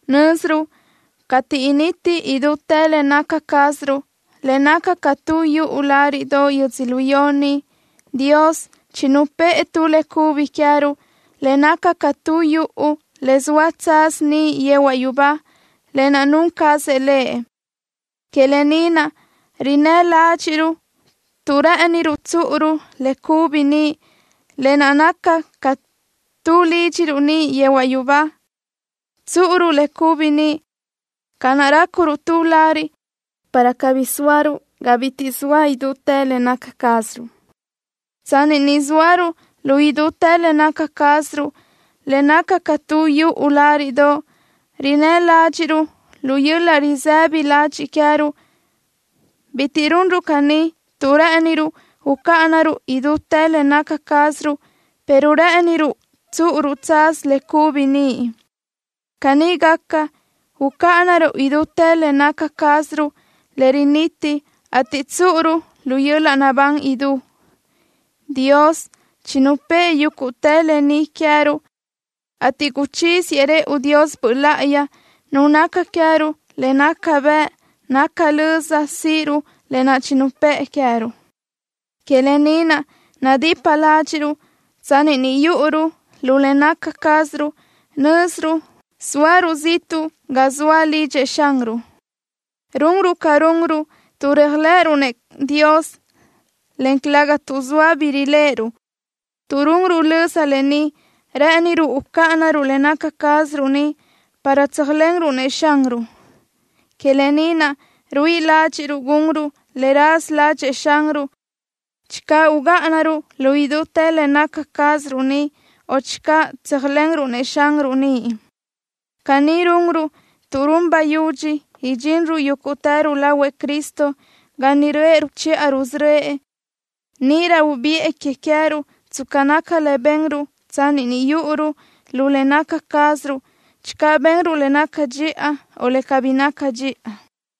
Nö́ziruʼ cateʼ initi idútë le naca cázaruʼ, le naca ca tu yuʼu láriʼdoʼ yödzölió ni, Dios chinupë́ʼë tu le cubi queë́ruʼ, le naca ca tu yuʼu le zoa tsaz niʼ yehuaʼ yubá, lë naʼ nun cazëʼ Lëʼ. Que lë ni naʼ rinnë́ ládxiʼruʼ tuʼ rë́ʼëniruʼ tsúʼuruʼ le cubi niʼ, lë naʼ naca ca tu lídxiruʼ niʼ yehuaʼ yubá. Tsúʼuruʼ le cubi niʼ ca naʼ rácuruʼ tu lariʼ, para cabí sóaruʼ ga bitiʼ zoa idútë le naca cázaruʼ. Tsanni ni zóaruʼ lu idútë le naca cázaruʼ, le naca ca tu yuʼu láriʼdoʼ, rinnë́ ládxiʼruʼ lu yöl-laʼ risëbi ladxiʼ queë́ruʼ. Bitiʼ runruʼ caní tuʼ rë́ʼëniruʼ ucáʼanaruʼ idútë le naca cázaruʼ, pero rë́ʼëniruʼ tsúʼuruʼ tsaz le cubi niʼ. Caní gaca, ucáʼanaruʼ idútë le naca cázaruʼ le riniti, ateʼ tsúʼuruʼ lu yöl-laʼ naʼbán idú. Dios chinupë́ʼë yúguʼtë lë ni queë́ruʼ, ateʼ guchíziëʼ rëʼu Dios Böʼ Láʼayi, Nu naca queë́ruʼ le naca bëʼ naca löza síʼiruʼ lë naʼ nupë́ʼë queë́ruʼ. Que lë ni naʼ nadipa ládxiʼruʼ. Tsanni ni yúʼuruʼ lu le naca cázaruʼ, nö́ziruʼ zóaruʼ ziʼtuʼ ga zoa lidxëʼ Xanruʼ. Runruʼ ca runruʼ tuʼ réajlëʼëruʼ-nëʼ Dios, en calëga tuʼ zoa bi riléʼeruʼ. Tuʼ runruʼ löza lë ni, rë́ʼëniruʼ ucáʼanaruʼ le naca cázaruʼ ni para tsöjsóalenruʼ-nëʼ Xanruʼ. Que lë ni naʼ ruíʼi ládxiʼruʼ gunruʼ le raza ládxëʼë Xanruʼ, channö ugáʼanaruʼ lu idútë le naca cázaruʼ ni, o channö tsöjsóalenruʼ-nëʼ Xanruʼ niʼ. Caní runruʼ tuʼ run bayudxi idxinruʼ yúguʼtëruʼ lahuëʼ Cristo ga niʼ röʼë ruchiʼa rusörö́ëʼ. Níʼirö ubiʼë que queë́ruʼ tsca naca le benruʼ tsanni ni yúʼuruʼ lu le naca cázaruʼ, channö benruʼ le naca dxiʼa o le cabí naca dxiʼa.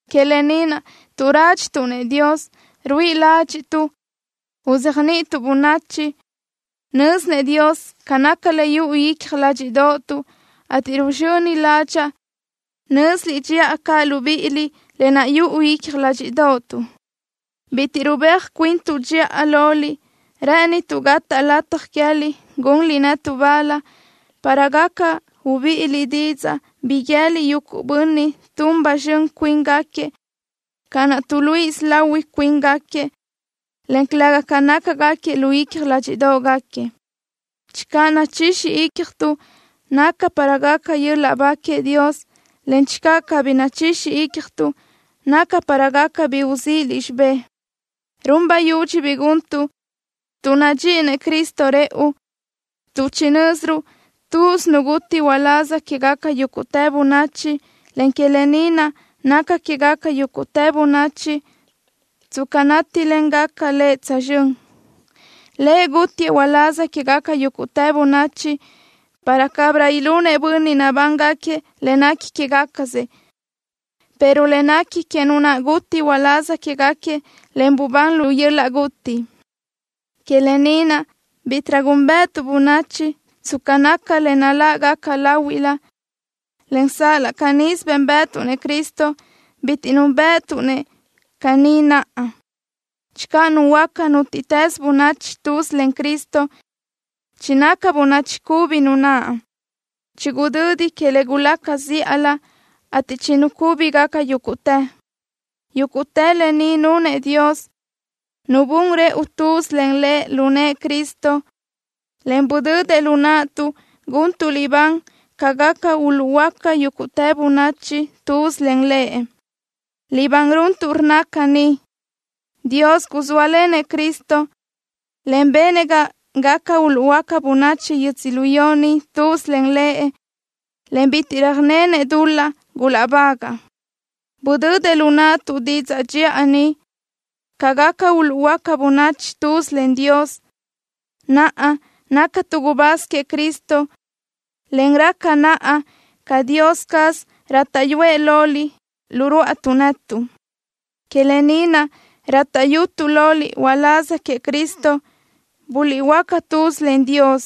Que lë ni naʼ, tuʼ rádxituʼ-nëʼ Dios, ruíʼi ládxiʼtuʼ uzéajniʼituʼ bönachi. Nö́zinëʼ Dios ca naca le yuʼu icja ládxiʼdoʼotuʼ, ateʼ ruzxöni ládxaʼa nö́ziliʼ dxiʼa caʼ libíʼiliʼ lë naʼ yuʼu icja ládxiʼdoʼotuʼ. Bitiʼ rubéaj cuintuʼ dxiʼa loliʼ. Rë́ʼënituʼ gataʼ lataj queë́liʼ gunliʼ netuʼ bal, para gaca ubíʼiliʼ didzaʼ, bi guië́liʼ yuguʼ bönniʼ tun ba zxön cuíngaquiëʼ ca naʼ tuʼluíʼisö lahui cuíngaquiëʼ, en calëga ca nácagaquiëʼ lu icja ládxiʼdoʼgaquiëʼ. Channö nachixi ícjatuʼ, naca para gaca yöl-laʼ ba queëʼ Dios, en channö cabí nachixi ícjatuʼ, naca para gaca bi uzíʼiliʼ xibé. Run bayudxi bi guntuʼ tuʼ nadxíʼinëʼ Cristo rëʼu, tuʼ chinö́ziruʼ tuz Nu guti uláz quégaca yúguʼtë bönachi, en que lë ni naʼ naca quégaca yúguʼtë bönachi tsca nátilengaca Lëʼ tsözxö́n. Lëʼ gútiëʼ uláz quégaca yúguʼtë bönachi para cabirö ilunëʼ bönniʼ nabángaquiëʼ le nequi quégacasëʼ, pero le nequi que Nu naʼ guti uláz quégaquiëʼ, en bubán lu yöl-laʼ guti. Que lë ni naʼ, bítiʼrö gúnbëʼëtuʼ bönachi tsca naca le naláʼgaca láhuiʼlö, en sal-laʼ canísö bénbëʼëtuʼ-nëʼ Cristo, bitiʼ núnbëʼëtuʼ-nëʼ caní naʼa. Channö nuhuöáca nútiʼtës bönachi tuz len Cristo, chinaca bönachi cubi nu naʼ. Chigudödi que le gulaca zíʼalö, ateʼ chinucúbigaca yúguʼtë. Yúguʼtë lë ni nunëʼ Dios, Nu bun rëʼu tuz len Lëʼ lu nëʼë Cristo, en budödëʼ lu naʼtuʼ guntuʼ libán ca gaca uluʼhuöáca yúguʼtë bönachi tuz len Lëʼ. Libán runtuʼ rnna caní: “Dios guzóalenëʼ Cristo, en benëʼ ga gaca uluʼhuöáca bönachi yödzölió ni tuz len Lëʼ, en bitiʼ röjnenëʼ dul-laʼ gulaʼbagaʼ.” Budödëʼ lu naʼtuʼ didzaʼ dxiʼa ni, ca gaca uluʼhuöáca bönachi tuz len Dios. Naʼa, nácatuʼ gubáz queëʼ Cristo, en raca naʼa ca Dios caz rátaʼyuëʼ loliʼ lu rúʼatuʼ netuʼ. Que lë ni naʼ rátaʼyutuʼ loliʼ uláz queëʼ Cristo, guliʼhuöáca tuz len Dios.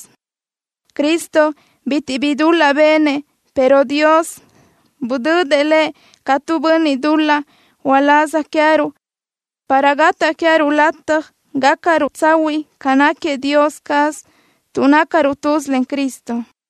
Cristo bitiʼ bi dul-laʼ benëʼ, pero Dios budödëʼ Lëʼ ca tu bönniʼ dul-laʼ uláz queë́ruʼ, para gataʼ queë́ruʼ lataj gácaruʼ tsahuiʼ ca náquiëʼ Dios caz tuʼ nácaruʼ tuz len Cristo.